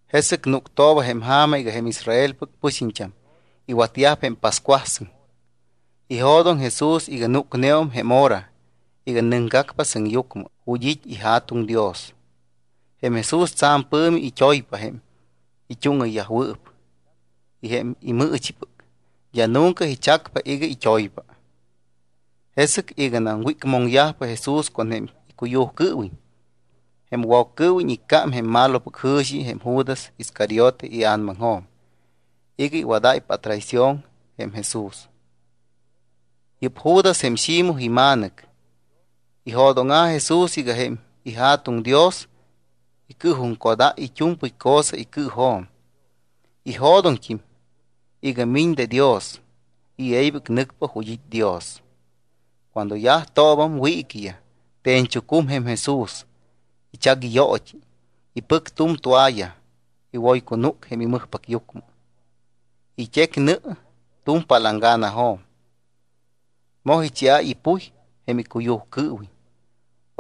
Jesɨc núctooba jém ja̱ma iga jém Israelpɨc pɨxiñt́am iwatyajpa jém pascuasɨŋ. Ijo̱doŋ Jesús iga núcneum jém hora iga nɨcgacpa sɨŋyucmɨ ju̱t́ it́ iJa̱tuŋ Dios. Jém Jesús tsa̱m pɨ̱mi it́oypa jém it́úŋɨyyajwɨɨp, jém imɨɨchipɨc, d́a nunca ichacpa iga it́oypa. Jesɨc iganam wícmoŋyajpa Jesús con jém icuyujcɨɨwiñ, jém Woccɨɨwiñ iccám jém malopɨc jɨ̱xi jém Judas Iscariote ia̱namaŋjo̱m iga iwadáypa atraición jém Jesús. Yɨ́p Judas jém Ximoj ima̱nɨc. Ijo̱dóŋa̱ Jesús iga jém iJa̱tuŋ Dios icɨɨjuŋcodáy it́u̱mpɨy cosa icɨɨjo̱m. Ijo̱doŋt́im iga miñ de Dios y e̱ybɨc nɨcpa ju̱t́ it́ Dios. Cuando yajtoobam wiiquiyaj, te̱ñchucum jém Jesús, ichac iyoot́i, ipɨc tu̱m toalla, iwoycunúc jém imɨjpacyucmɨ. It́ec nɨ tu̱m palanganajo̱m, moj icheáy ipuy jém icuyujcɨɨwiñ.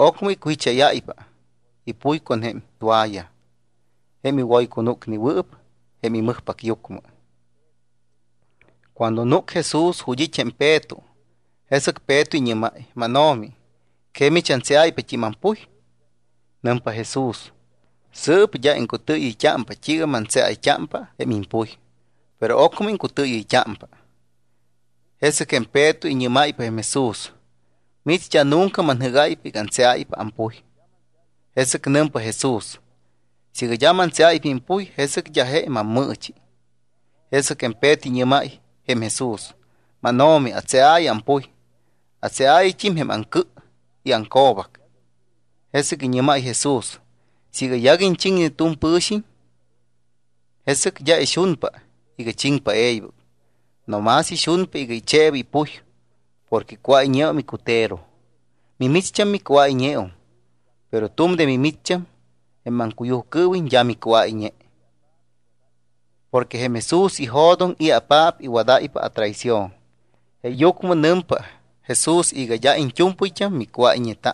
Ocmɨ icujicháyáypa ipuy con jém toalla jém iwoycunúcnewɨɨp jém imɨjpacyucmɨ. Cuando núc Jesús ju̱t́ it́ jém Peto, jesɨc Peto iñɨ́máy: —MánO̱mi, ¿que mich antseáypat́im ampuy? Nɨmpa Jesús: —Sɨɨp d́a iŋcutɨɨyɨ́ypa t́iiga mantseayt́ámpa jém impuy, pero ocmɨ iŋcutɨɨyɨyt́ámpa. Jesɨc jém Peto iñɨ́máypa jém Jesús: —Mich d́a nunca manjɨ́gáypa iga antseáypa ampuy. Jesɨc nɨmpa Jesús: —Siiga d́a mantseáypa impuy, jesɨc d́a je mammɨɨchi. Jesɨc Peto iñɨ́máy jém Jesús: —MánO̱mi, atseaayɨ ampuy. Atseaayɨt́im jém aŋcɨ y aŋco̱bac. Jesɨc iñɨ́máy Jesús: —Siiga yaguiñ chiŋne tu̱m pɨ̱xiñ, jesɨc d́a ixunpa iga chiŋpa e̱ybɨc. No más ixunpa iga icheeba ipuy porque cuáyñeum icutero. Mimicht́am micuáyñeum, pero tu̱m de mimicht́am, jém maŋcuyujcɨɨwiñ, d́a micuáyñe. Porque jém Jesús ijo̱doŋ i̱apaap iwadáypa atraición. Jeeyucmɨ nɨmpa Jesús iga: “D́a iñt́u̱mpɨyt́am micuáyñeta.”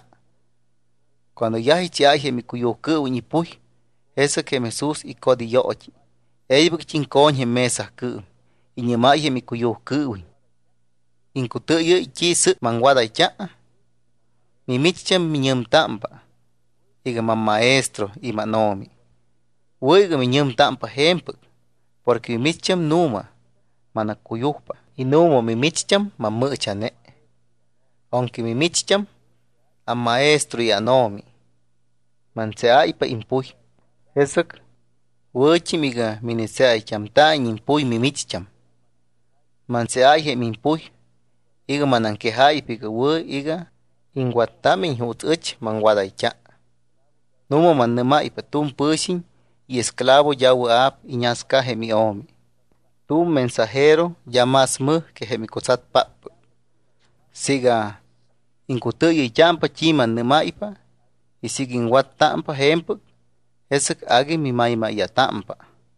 Cuando yaj icheáy jém icuyujcɨɨwiñ ipuy, jesɨc jém Jesús icot iyoot́i, e̱ybɨct́im co̱ñ jém mesacɨɨm. Iñɨ́máy jém icuyujcɨɨwiñ: —¿Iŋcutɨɨyɨ́y t́i sɨɨp maŋwadayt́a? Mimicht́am annɨ́mayt́ámpa iga: mamMaestro y mánO̱mi. Wɨ̱ iga miñɨmtámpa je̱mpɨc porque mimicht́am nu̱ma manaccuyujpa y nu̱ma mimicht́am mammɨɨcha̱ne. Aunque micht́am amMaestro y ánO̱mi, mantseáypa impuy, jesɨc wɨ̱t́im iga minitseayt́amta̱iñ impuy mimicht́am. Mantseáy jém impuy iga manaŋquejáypa iga wɨ̱ iga iŋwattámiñ juuts ɨch maŋwadayt́a. Nu̱ma mannɨ́máypa, tu̱m pɨ̱xiñ iesclavo d́a wɨa̱p iñasca jém io̱mi. Tu̱m mensajero d́a más mɨj que jém icutsatpáppɨc. Siiga iŋcutɨɨyɨyt́ámpa t́i mannɨ́máypa y siiga iŋwattámpa je̱mpɨc, jesɨc agui mimaymáya̱támpa.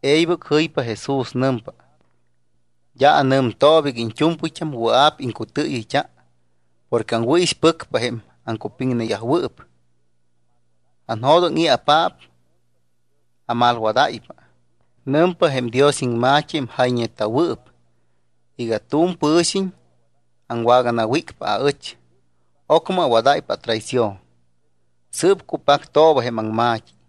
E̱ybɨc jɨypa Jesús. Nɨmpa: —D́a anɨmtooba iga iñt́u̱mpɨyt́am wɨa̱p iŋcutɨɨyɨyt́a porque aŋwɨ̱ixpɨcpa jém aŋcupiŋneyajwɨɨp. Anjo̱doŋ i̱apaap amalwadáypa. Nɨmpa jém Dios iŋma̱t́i, jém jayñeta̱wɨɨp, iga: “Tu̱m pɨ̱xiñ aŋwaganawícpa aɨch, ocmɨ awadáypa atraición.” Sɨɨp cupactooba jém aŋma̱t́i.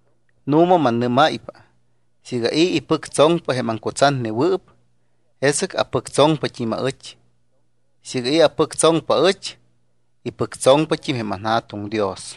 Nu̱ma, mannɨ́máypa siiga i̱ ipɨctsoŋpa jém aŋcutsatnewɨɨp, jesɨc apɨctsoŋpat́im aɨch. Siiga i̱ apɨctsoŋpa aɨch, ipɨctsoŋpat́im jém anJa̱tuŋ Dios.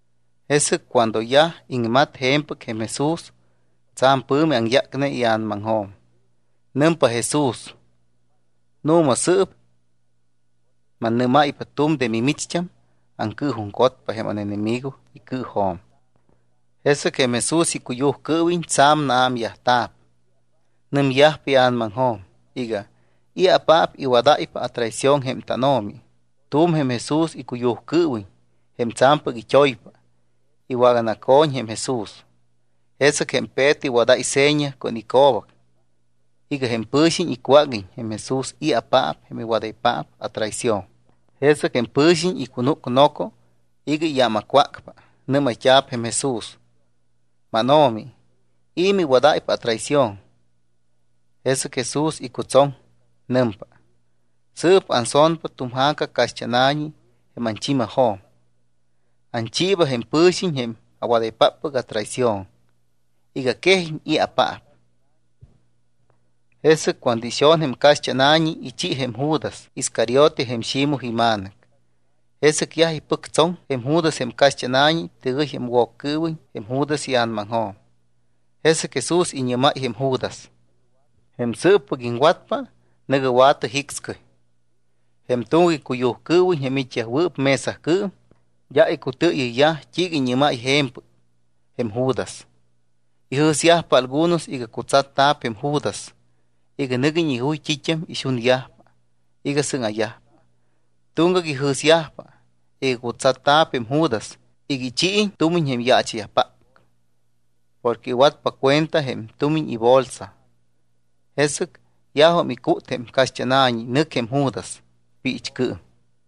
Jesɨc cuando yaj iŋmat je̱mpɨc jém Jesús, tsa̱m pɨ̱mi aŋyácne ia̱namaŋjo̱m. Nɨmpa Jesús: —Nu̱ma sɨɨp mannɨ́máypa, tu̱m de mimicht́am acɨɨjuŋcotpa jém ánenemigo icɨɨjo̱m. Jesɨc jém Jesús icuyujcɨɨwiñ tsa̱m naámyajta̱p. Nɨmyajpa ia̱namaŋjo̱m iga: “¿I̱apaap iwadáypa atraición jém tánO̱mi?” Tu̱m jém Jesús icuyujcɨɨwiñ, jém tsa̱mpɨc it́oypa, iwaganaco̱ñ jém Jesús. Jesɨc jém Peto iwadáy seña con ico̱bac iga jém pɨ̱xiñ icwáguiñ Jesús i̱apaap jém iwadaypaap atraición. Jesɨc jém pɨ̱xiñ icunúc noco iga iyámacwácpa. Nɨ́mayt́a̱p jém Jesús: —MánO̱mi, ¿i̱ miwadáypa atraición? Jesɨc Jesús icutsoŋ. Nɨmpa: —Sɨɨp anso̱npa tu̱m ja̱ca caxt́ána̱ñi jém anchimajo̱m, anchiiba jém pɨ̱xiñ jém awadaypáppɨc atraición iga quejiñ i̱apaap. Jesɨc cuando ixo̱n jém caxt́ána̱ñi, ichi jém Judas Iscariote, jém Ximoj ima̱nɨc. Jesɨc yaj ipɨctsoŋ jém Judas jém caxt́ána̱ñi, tɨgɨy jém Woccɨɨwiñ jém Judas ia̱namaŋjo̱m. Jesɨc Jesús iñɨ́máy jém Judas: —Jém sɨɨppɨc iŋwatpa, nɨ̱gɨ wa̱tɨ jicscɨy. Jém tuŋgac icuyujcɨɨwiñ, jém it́yajwɨɨp mesacɨɨm, d́a icutɨɨyɨyyaj t́iiga iñɨ́máy je̱mpɨc jém Judas. Ijɨ̱syajpa algunos iga cutsatta̱p jém Judas iga nɨguiñ ijuy t́it́am ixunyajpa iga sɨŋa̱yajpa. Tuŋgac ijɨ̱syajpa iga cutsatta̱p jém Judas iga ichiiñ tumiñ jém yaacha̱yajpáppɨc. Porque iwatpa cuenta jém tumiñ ibolsa. Jesɨc yajum icút jém caxt́ána̱ñi, nɨc jém Judas. Piichcɨɨm.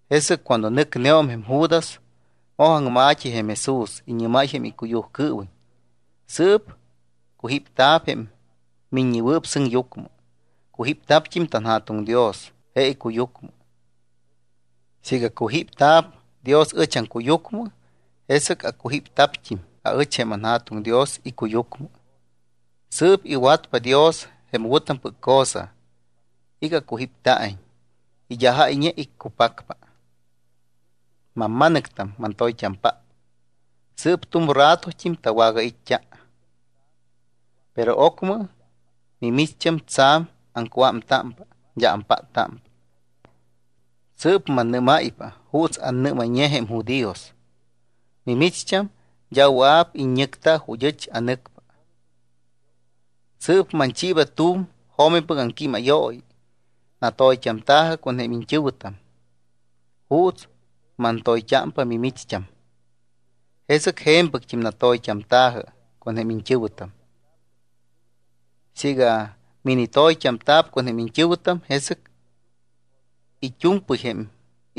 Jesɨc cuando nɨcneum jém Judas, moj aŋma̱t́i jém Jesús. Iñɨ́máy jém icuyujcɨɨwiñ: —Sɨɨp cujípta̱p jém Miññewɨɨp Sɨŋyucmɨ. Cujípta̱pt́im tanJa̱tuŋ Dios je icuyucmɨ. Siiga cujípta̱p Dios ɨch aŋcuyucmɨ, jesɨc acujípta̱pt́im aɨch jém anJa̱tuŋ Dios icuyucmɨ. Sɨɨp iwatpa Dios jém wɨ̱tampɨc cosa iga acujípta̱iñ y d́a jáyñe iccupacpa. Mamma̱nɨctam, mantoyt́ampáppɨc, sɨɨp tu̱m ratot́im tawagait́t́a. Pero ocmɨ mimicht́am tsa̱m aŋcuámtámpa, d́a ampáttámpa. Sɨɨp mannɨ́máypa juuts annɨ́mayñe jém judíos, mimicht́am d́a wɨa̱p iññɨcta ju̱t́ ɨch anɨcpa. Sɨɨp manchiiba tu̱m jo̱mipɨc aŋquímayooyi, natoyt́amta̱jɨ con jém iñt́ɨ̱wɨtam. Juuts mantoyt́ámpa mimicht́am, jesɨc je̱mpɨct́im natoyt́amta̱jɨ con jém iñt́ɨ̱wɨtam. Siiga minitoyt́amta̱p con jém iñt́ɨ̱wɨtam, jesɨc it́u̱mpɨy jém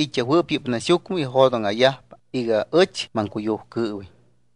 it́yajwɨɨp yɨ́p naxyucmɨ ijo̱dóŋa̱yajpa iga ɨch maŋcuyujcɨɨwiñ.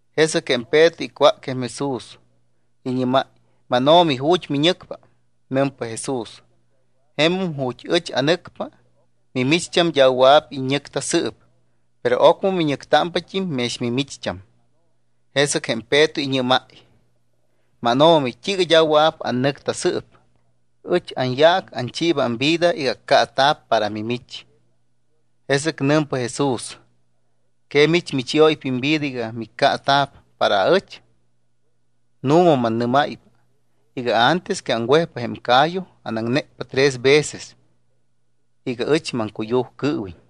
Jesɨc jém Peto icwác jém Jesús, iñɨ́máy: —MánO̱mi, ¿ju̱t́ miñɨcpa? Nɨmpa Jesús: —Jemum ju̱t́ ɨch anɨcpa, mimicht́am d́a wɨa̱p iññɨcta sɨɨp, pero ocmɨ miñɨctámpat́im mex mimicht́am. Jesɨc jém Peto iñɨ́máy: —MánO̱mi, ¿t́iiga d́a wɨa̱p annɨcta sɨɨp? Ɨch anyaac anchiiba amvida iga accaata̱p para mimich. Jesɨc nɨmpa Jesús: —¿Que mich michióypa imvida iga miccaata̱p para aɨch? Nu̱ma mannɨ́máypa iga antes que aŋwejpa jém ca̱yu, anaŋnécpa tres veces iga ɨch maŋcuyujcɨɨwiñ.